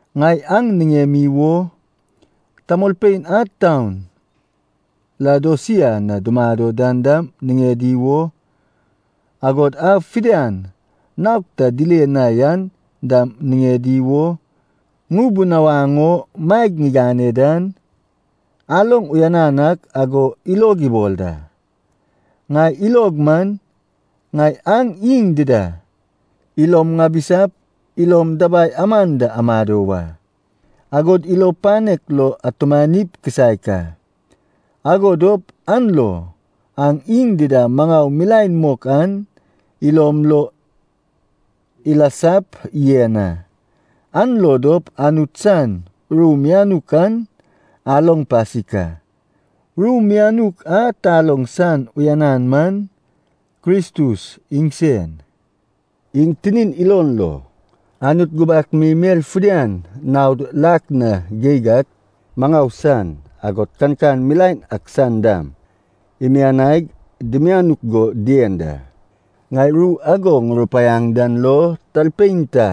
Ŋai aŋ niŋemi wo, tamolpein a taun Laodosia na dumado dan dam niŋedi wo, agod a fidian naog ta dile na yan dam niŋedi wo, ŋubunawaŋ o maeg ŋigane dan, aloŋ uyanan ak ago ilog ibol da. Ŋai ilog man, ŋai aŋ iŋ dida ilom ŋabisap, ilom dabai amam da amado wa, agod ilo panek lo atumanip kisaek a. Ago dop an lo aŋ iŋ dida maŋau milaen mok an ilom lo ilasap yen a. An lo dop Anut san ru mianuk an aloŋ pasik a. Ru mianuk a taloŋ san uyanan man Kristus iŋsen. Iŋ tinin ilon lo, Anut gubak mi mel fidian naod lak na geig ak maŋau san, agod kankan milaen ak san dam, imianaig dimianuk go dien da. Ŋai ru ago ŋurupaiaŋ dan lo, talpein ta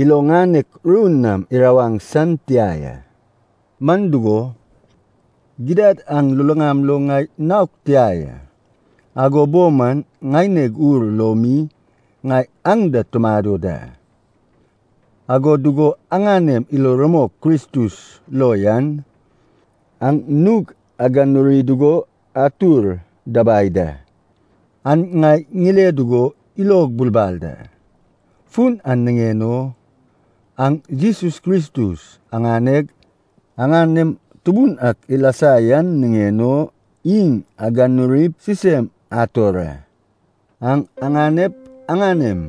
ilo ŋanek ru nam irawaŋ san tia ya. Man dugo, gidad aŋ luluŋam lo ŋai naog tia ya, ago bo man ŋaineg ur lo mi ŋai aŋ da tumado da. Ago dugo aŋanem ilo rumok Kristus lo yan, aŋ nug aganuri dugo atur dabai da, an ŋai ŋile dugo ilog bulbal da. Fun an niŋen o, aŋ Jesus Kristus aŋaneg aŋanem Tubun ak ilasa yan niŋen o, iŋ aganurip sisem ator a. Aŋ aganep aŋanem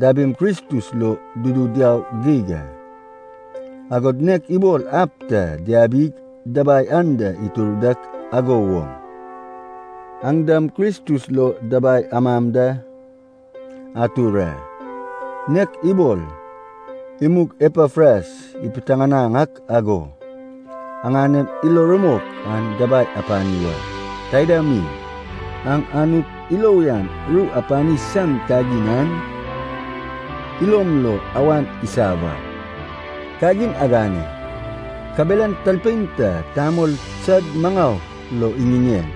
dabim Kristus lo dudu diau geig a. Agod nek ibol ab ta diabig dabai anda itur dak ago woŋ, aŋ dam Kristus lo dabai amam da atur a. Nek ibol imug Epafras ipiteŋanaŋ ak ago, aŋanem ilo rumok an dabai apani wa. Taida mi, aŋ Anut ilo uyan ru apani san kagin an ilom lo awan isa wa. Kagin agane, kabelan talpein ta tamol sad maŋau lo iŋiŋeŋ,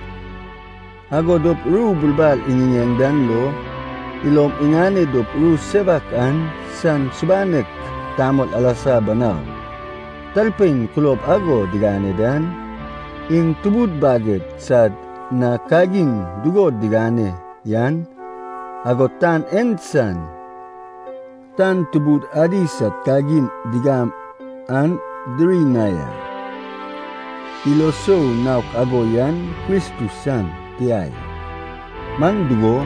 ago dop ru bulbal iŋiŋeŋ dan lo, ilom iŋane dop ru sewak an san subanek tamol alasa banau. Talpein kulob ago digane dan, iŋ tubud baged sad na kagin dugo diŋane yan, agod tan en san tan tubud adi sad kagin digam an diri na ya. Ilo sou naok ago yan Kristus san tia ya. Man dugo,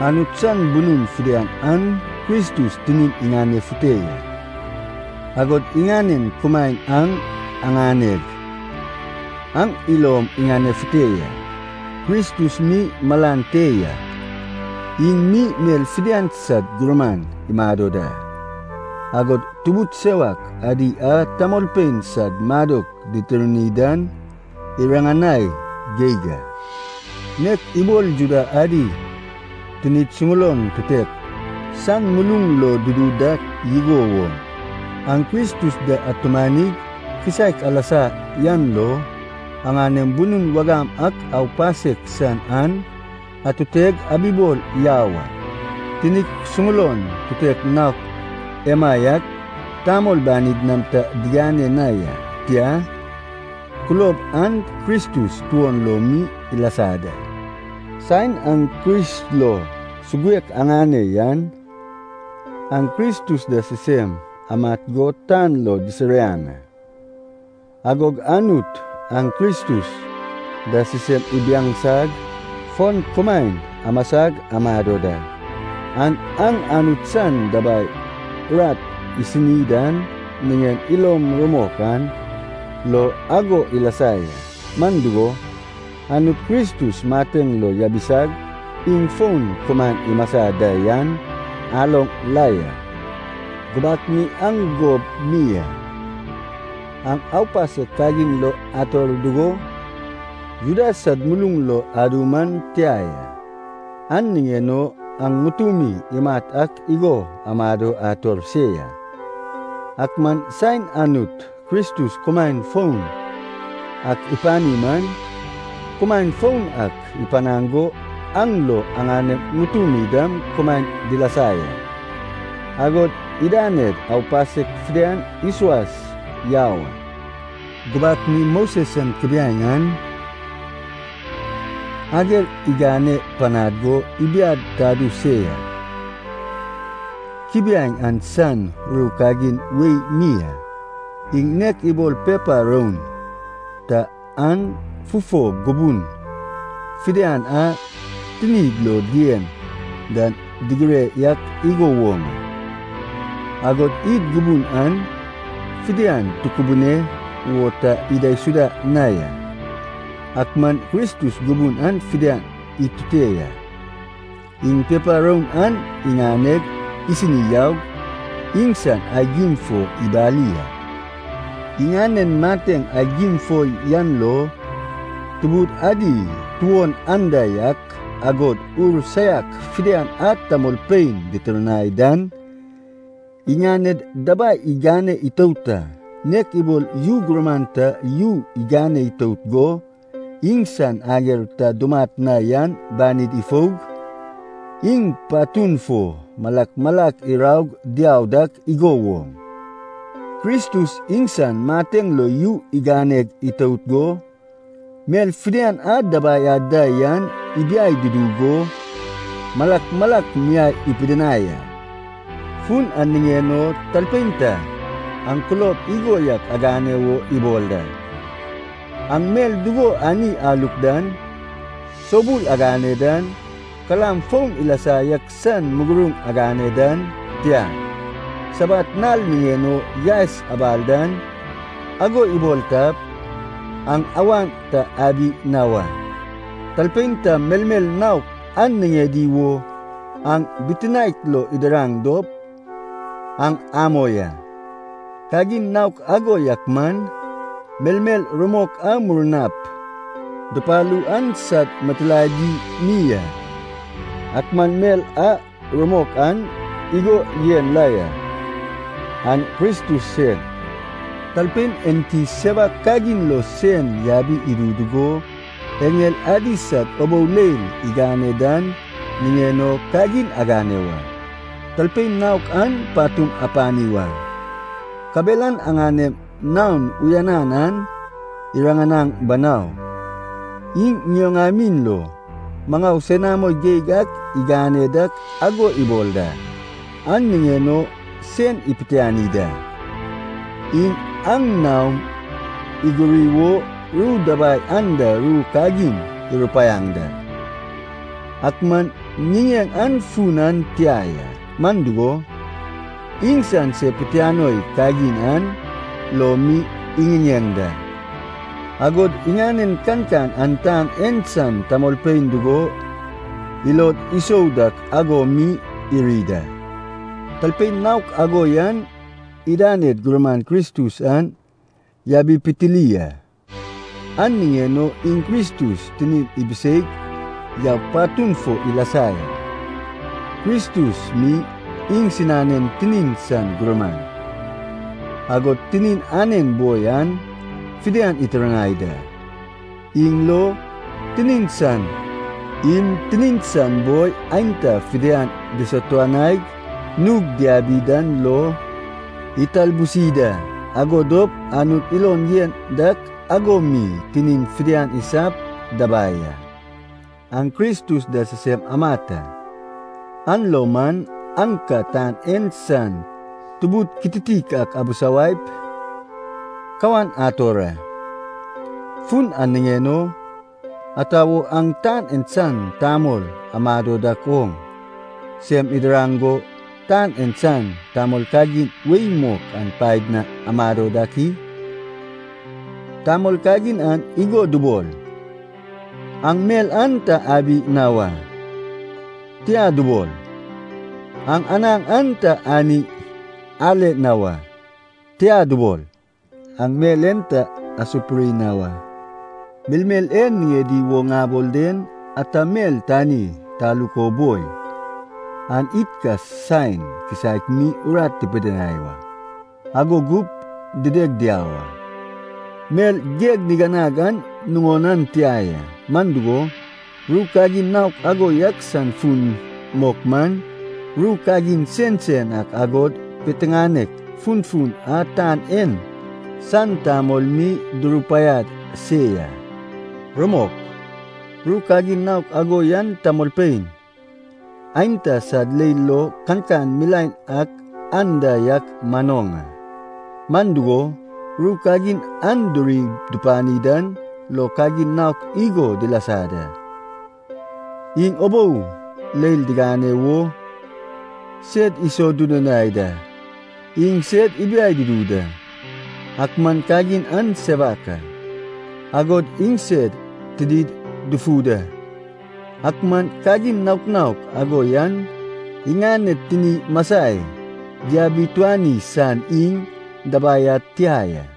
Anut san bunun fidian an Kristus tinin iŋanefute ya. Agod iŋanen kumaen aŋ aŋaneg, aŋ ilom iŋanefute ya. Kristus mi malan te ya, iŋ mi mel fidian sad gurman imado da, agod tubud sewak adi a tamolpein sad madok ditirni dan iriŋanai geig a. Nek ibol Juda adi tinid suŋulon tutek san muluŋ lo dudu dak igo woŋ, aŋ Kristus da atumanig kisaek alasa yan lo, aŋanem bunum wagam ak aupasek san an atuteg abibol yau a. Tinik suŋulon tutek naok emaiak tamol banid nam ta digane na ya, tia, kulob an Kristus tuon lo mi ilasa da. Saen aŋ Kris lo suguek aŋane yan, aŋ Kristus da sisem amat go tan lo disiriaŋ a. Agog Anut aŋ Kristus da sisem ibiaŋsag fon kumaem amasag amado da. An aŋ Anut san dabai urat isini dan niŋen ilom rumok an lo ago ilasa ya, man dugo, Anut Kristus mateŋ lo yabisag iŋ fon kumaen imasa da yan aloŋ la ya. Gubak mi aŋ gob mi a, aŋ aupasek kagin lo ator dugo, Juda sad muluŋ lo adu man tia ya. An niŋen o aŋ ŋutumi imat ak igo amado ator se ya. Ak man saen Anut Kristus kumaen foun ak ipani man, kumaen foun ak ipanaŋ go an lo aŋanem ŋutumi dam kumaen dilasa ya. Agod idaned aupasek fidian isuas yau a. Gubak mi Moses san kubiaeŋ an, ager igane panad go ibiad tadu se ya. Kubiaeŋ an san ru kagin wei mi a, iŋ nek ibol pepa roun ta an fufo gubun fidian a tinid lo dien dan digire yak igo woŋ a, agod id gubun an fidian tukubune wo ta idaisuda na ya. Ak man Kristus gubun an fidian itute ya, iŋ pepa roun an iŋaneg isini yaug, iŋsan aigim fo ibali a. Iŋanen mateŋ aigim fo yan lo, tubud adi tuon anda yak, agod ur saiak fidian a tamolpein ditirnai dan, iŋaned dabai igane itout a. Nek ibol yu gurman ta yu igane itout go, iŋsan ager ta dumat na yan banid ifoug, iŋ patun fo malak malak iraug diau dak igo woŋ, Kristus iŋsan mateŋ lo yu iganeg itout go, mel fidian a dabai ad da yan ibiai dudu go, malak malak miai ipidinai a. Fun an niŋen o talpein ta aŋ kulob igo yak agane wo ibol da: aŋ mel dugo ani aluk dan, soubul agane dan, kalam foun ilasa yak san muguruŋ agane dan, tia, Sabat nal niŋen o yaes abal dan, ago ibol tap, aŋ awan ta abi na wa. Talpein ta melmel naok an niŋedi wo aŋ bitinaek lo idiraŋ dop, aŋ amoi a. Kagin naok ago yak man, melmel rumok a murnap dupalu an sad mitilaedi mi a, ak man mel a rumok an igo yen la ya, an Kristus sen. Talpein enti sewak kagin lo sen yabi idu dugo, eŋel adi sad ubou leil igane dan niŋen o kagin agane wa. Talpein naok an patum apani wa, kabelan aŋanem naon uyanan an iriŋanaŋ banau. Iŋ ŋioŋamin lo maŋau senamo geig ak iŋane dak ago ibol da, an niŋen o sen ipitiani da. Iŋ aŋ naom iguri wo ru dabai anda ru kagin irupaiaŋ da, ak man ŋiŋeŋ an fun an tia ya. Man dugo, iŋsan se pitianoi kagin an lo mi iŋiŋeŋ da, agod iŋanen kankan an tan en san tamolpein dugo ilod isou dak ago mi iri da. Talpein naok ago yan idaned gurman Kristus an yabipitili a. An niŋen o iŋ Kristus tinin ibiseig yaug patun fo ilasa ya. Kristus mi iŋsinanen tinin san gurman, agod tinin anen boi an fidian itirnai da. Iŋ lo, tinin san im, tinin san boi aenta fidian disatuanaig nug diabi dan lo italbusi da, ago dop Anut ilon yen dak ago mi tinin fidian isap dabai a. Aŋ Kristus da sisem amat a, an lo man aŋ ka tan en san tubud kititik abisawaip kawan ator a. Fun an niŋen o, ata wo aŋ tan en san tamol amado dak oŋ, sem idiraŋ go tan en san tamol kagin wei mok an paed na amado dak i? Tamol kagin an igo dubol, “Aŋ mel an ta abi na wa.” Tia dubol, “Aŋ anaŋ an ta ani ale na wa.” Tia dubol, “Aŋ mel en ta asupuri na wa.” Melmel e niŋedi wo ŋabol den, ata mel tani taluk o boi, an id ka saen kisaek mi urat tipidinai wa, ago gup dideg diau a. Mel geg niganag an nuŋon an tia ya, man dugo, ru kagin naok ago yak san fun mok man, ru kagin sensen ak agod piteŋanek funfun a tan en san tamol mi durupaiad se ya. Rumok, ru kagin naok ago yan tamolpein aenta sad leil lo kankan milaen ak anda yak manoŋ a. Man dugo, ru kagin an diri dupani dan lo kagin naok igo dilasa da: iŋ ubou leil digane wo sed isodudunai da, iŋ sed ibiai dudu da, (ak man kagin an sewak a,) agod iŋsed tinid dufu da. Ak man kagin naok naok ago yan iŋaned tini masai diabituani san iŋ dabai ad tia ya.